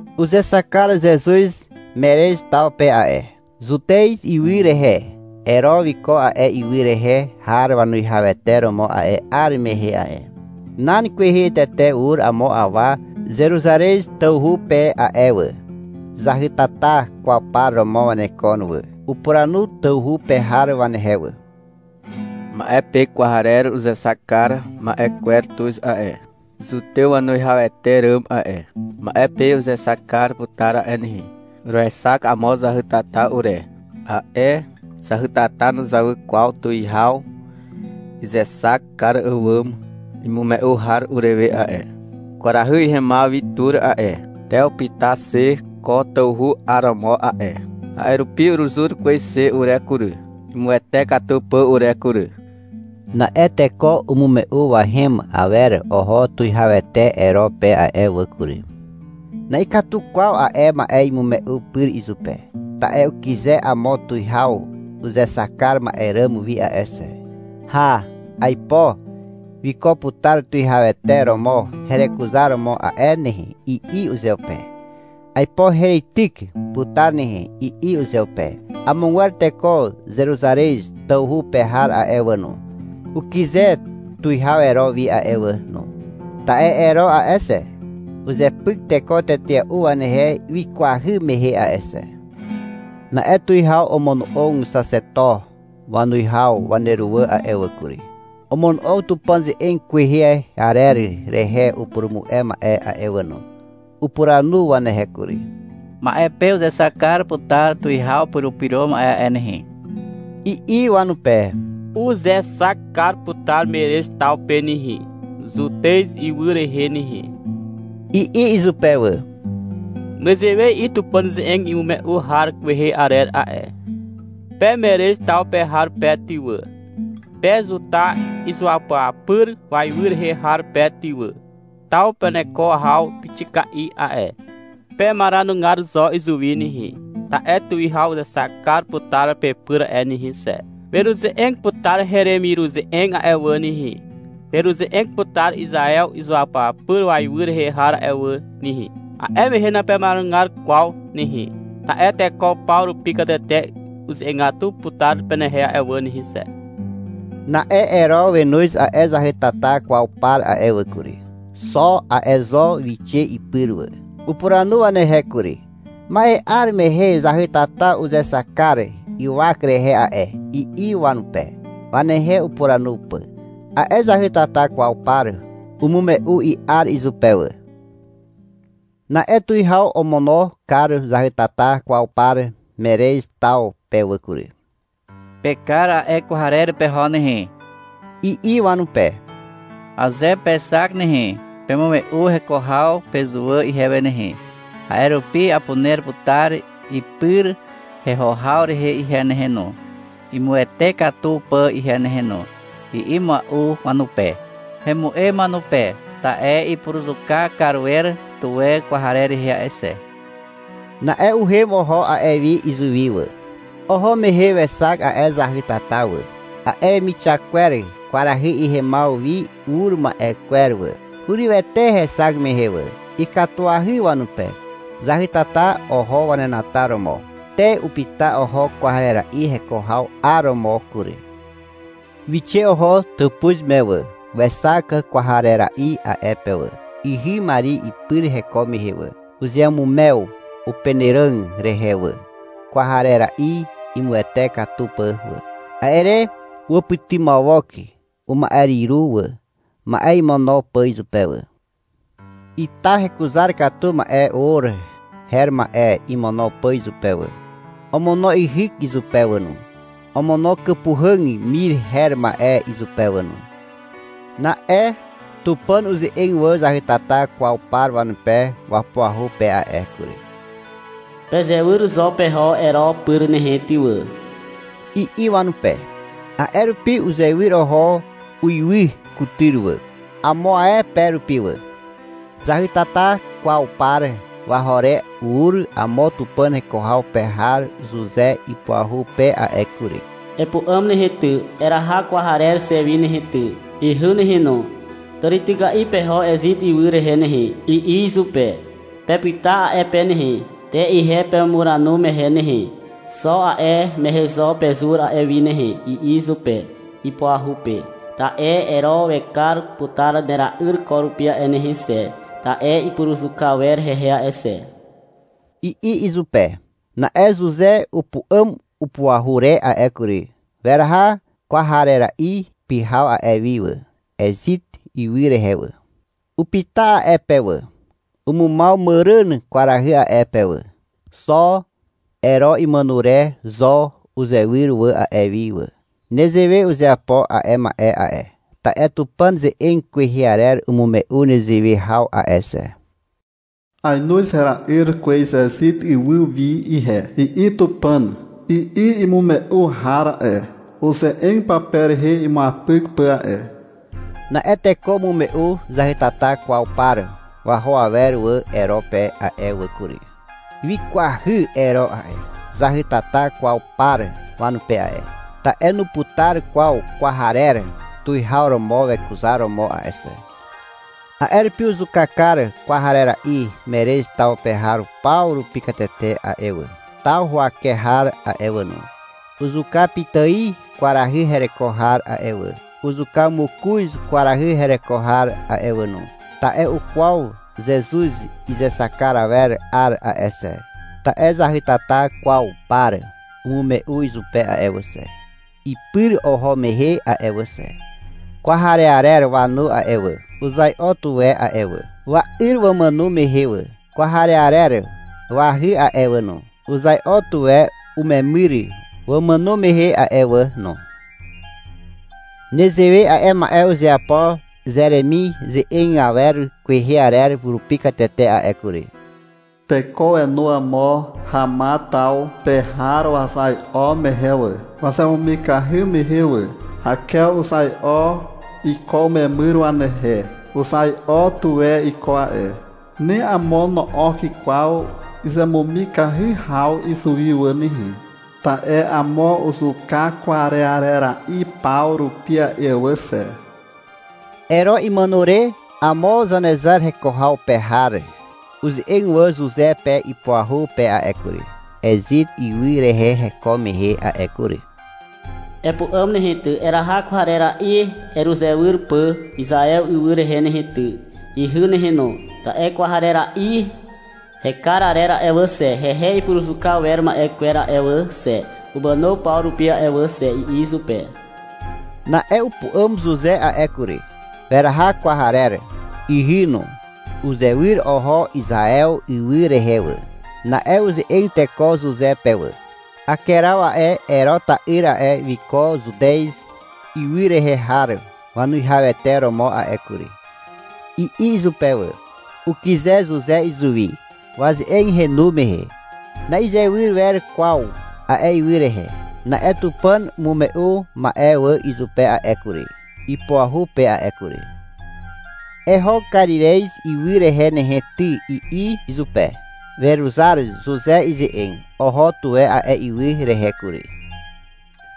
Uzexak kar Zezuz Merez taw pe a'e, Zutez ywy rehe. Ero wiko a'e ywy rehe har wanuwihawete romo a'e 'ar mehe a'e. Nan kwehe tete ur amo awa Zeruzarez tawhu pe a'e wà. Zahytata kwaw par romo wanekon wà. Upuranu tawhu pe har wanehe wà. — Ma'e pe kwarer uzexak kar ma'e kwer tuz a'e, Zutew wanuwihawete ràm a'e. Ma'e pe uzexak kar putar a'e nehe. Uruexak amo zahytata ure. A'e zahytata nuzawy kwaw tuwihaw izexak kar àwàm imume'u har urewe a'e. Kwarahy ihemaw wi tur a'e, te upyta xe ko tawhu 'aromo a'e. A'e rupi uruzur kwez xe ure kury, imuwete katu pà ure kury. Na'e teko umume'u wahem awer oho tuwihawete Ero pe a'e wà kury. Na'ikatu kwaw a'e ma'e imume'u pyr izupe. Ta'e ukyze amo tuwihaw uzexak kar ma'e ràm wi a'e xe. — Hà, aipo wiko putar tuwihawete romo herekuzaromo a'e nehe, i'i uzeupe. — Aipo hereityk putar nehe, i'i uzeupe. Amogwer teko Zeruzarez tawhu pe har a'e wà no, ukyze tuwihaw Ero wi a'e wà no. Ta'e Ero a'e xe, uzepyk teko tetea'u wanehe wikwahy mehe a'e xe. Na'e tuwihaw omono'og xaxeto wanuwihaw waneruwà a'e wà kury. Omono'og Tupàn ze'eg kwehe arer rehe upurumu'e ma'e a'e wà no. Upuranu wanehe kury. — Ma'e pe uzexak kar putar tuwihaw Purupyro Ma'e a'e nehe, i'i wanupe. — Uzexak kar putar Merez taw pe nehe, Zutez ywy rehe nehe, i'i izupe wà. — Nezewe i'i Tupàn ze'eg imume'u har kwehe arer a'e. Pe Merez taw pe har pe ty wà, Pe Zuta izuapyapyr waiwy rehe har pe ty wà. Taw peneko haw pixika'i a'e. Pemaranugar zo izuwi nehe. Ta'e tuwihaw uzexak kar putar pepyr a'e nehe xe. Weruze'eg putar heremiruze'eg a'e wà nehe. Weruze'eg putar Izaew izuapyapyr waiwy rehe har a'e wà nehe. A'e mehe napemaranugar kwaw nehe. Ta'e teko paw rupi katete uze'egatu putar penehe a'e wà nehe xe. Na'e Ero wenoz a'e zahytata kwaw par a'e wà kury. Xo a'e zo wixe ipyr wà. Upuranu wanehe kury. — Ma'e 'ar mehe zahytata uzexak kar ywak rehe a'e, i'i wanupe, wanehe upuranu pà. A'e zahytata kwaw par umume'u i'ar izupe wà. Na'e tuwihaw omono kar zahytata kwaw par Merez taw pe wà kury. — Pekar a'e kwarera'i peho nehe, i'i wanupe. — Aze pexak nehe, pemume'u heko haw pezuwà ihewe nehe. A'e rupi apuner putar ipyr heho haw rehe ihe nehe no, imuwete katu pà ihe nehe no, i'i mua'u wanupe. (Hemu'em wanupe, ta'e ipuruzuka kar wer tuwe kwarer rehe a'e xe). Na'e uhem oho a'e wi izuwi wà. Oho mehe wexak a'e zahytata wà, a'e wemixak kwer kwarahy ihemaw wi ur ma'e kwer wà. Hurywete hexak mehe wà. Ikatuahy wanupe. Zahytata oho wanenataromo. Te upyta oho kwarera'i heko haw 'aromo kury. Wixe oho tàpuz me wà. Wexak kwarera'i a'e pe wà, ihy Mari ipyr heko mehe wà. Uzeamumew upenàràg rehe wà, kwarera'i imuwete katu pà wà. A'e re uwàpytymawok uma'eryru wà, ma'e imono pà izupe wà. Ita hekuzar katu ma'e or her ma'e imono pà izupe wà. Omono yhyk izupe wà no. Omono kàpuhàg mir her ma'e izupe wà no. Na'e Tupàn uze'eg wà zahytata kwaw par wanupe wapuahu pe a'e kury. — Pezewyr zo peho Ero pyr nehe ty wà, i'i wanupe. A'e rupi uzewyr oho uiwy kutyr wà, amo ae pe rupi wà. Zahytata kwaw par waho re ur amo Tupàn heko haw pe har Zuze ipuahu pe a'e kury. — Epu'àm nehe ty, eraha kwarer xe wi nehe ty, ihy nehe no. Tàrityka'i peho Ezit ywy rehe nehe, i'i izupe. — Pepyta a'e pe nehe. Te ihe pemumuranu mehe nehe. Xo a'e mehe zo pezur a'e wi nehe, i'i izupe, ipuahu pe. — Ta'e Ero wekar putar nera'yr ko rupi a'e nehe xe, ta'e ipuruzuka wer hehe a'e xe, i'i izupe. Na'e Zuze upu'àm upuahu re a'e kury. Weraha kwarera'i pyhaw a'e wi wà, Ezit ywy rehe wà. Upyta a'e pe wà. (Umumaw Màràn kwarahy a'e pe wà.) Xo Ero imàno re zo uzewyr wà a'e wi wà. Nezewe uzeapo a'e ma'e a'e, ta'e Tupàn ze'eg kwehe arer umume'u nezewe haw a'e xe. — Aenoz hera'yr kwez Ezit ywy wi ihe, i'i Tupàn, i'i imume'u har a'e, uze'eg pape rehe imuapyk pà a'e. Na'e teko umume'u zahytata kwaw par waho awer wà Ero pe a'e wà kury. Wikwahy Ero a'e, zahytata kwaw par wanupe a'e. (Ta'e nuputar kwaw kwarer tuwihaw romo wekuzaromo a'e xe.) A'e rupi uzuka kar kwarera'i Merez taw pe har paw rupi katete a'e wà, taw huwake har a'e wà no. Uzuka pitài kwarahy hereko har a'e wà. Uzuka mokoz kwarahy hereko har a'e wà no. Ta'e ukwaw Zezuz izexak kar awer 'ar a'e xe. Ta'e zahytata kwaw par umume'u izupe a'e wà xe, ipyr oho mehe a'e wà xe. (Kwarearer wanu a'e wà, uzai'o tuwe a'e wà, wa'yr wamàno mehe wà. Kwarearer wahy a'e wà no, uzai'o tuwe umemyr wamàno mehe a'e wà no.) Nezewe a'e ma'e uzeapo Zeremi ze'eg awer kwehe arer rupi katete a'e kury. Teko wenu amo Hama taw pe har wazai'o mehe wà, Wazemumikahy mehe wà. Hakew uzai'o iko umemyr wanehe. Uzai'o tuwe iko a'e. Ni amo no'ok kwaw izemumikahy haw izuwi wà nehe. Ta'e amo uzuka kwarearera'i paw rupi a'e wà xe. Ero imàno re, amo Zanezar heko haw pe har uze'eg wà Zuze pe ipuahu pe a'e kury, Ezit ywy rehe heko mehe a'e kury. — Epu'àm nehe ty, eraha kwarera'i heruzewyr pà Izaew ywy rehe nehe ty, ihy nehe no, ta'e kwarera'i hekar arer a'e wà xe, hehe ipuruzuka wer ma'e kwer a'e wà xe, umàno paw rupi a'e wà xe, i'i izupe. Na'e upu'àm Zuze a'e kury. Weraha kwarer, ihy no. Uzewyr oho Izaew ywy rehe wà. Na'e uze'eg teko Zuze pe wà. — Akeraw a'e, Ero ta'yr a'e, wiko Zutez ywy rehe har wanuwihawete romo a'e kury, i'i izupe wà. Ukyze Zuze izuwi waze'eg henu mehe. Na'izewyr wer kwaw a'e ywy rehe. Na'e Tupàn umume'u ma'e wà izupe a'e kury, ipuahu pe a'e kury. — Eho Karirez ywy rehe nehe ty, i'i izupe. Weruzar Zuze ize'eg. Oho tuwe a'e ywy rehe kury.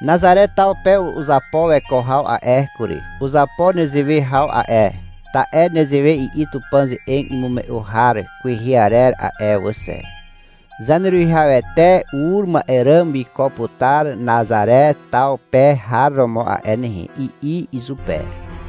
Nazare taw pe uzapo weko haw a'e kury. Uzapo nezewe haw a'e, ta'e nezewe i'i Tupàn ze'eg imume'u har kwehe arer a'e wà xe. — Zaneruwihawete ur ma'e ràm wiko putar Nazare taw pe har romo a'e nehe, i'i izupe.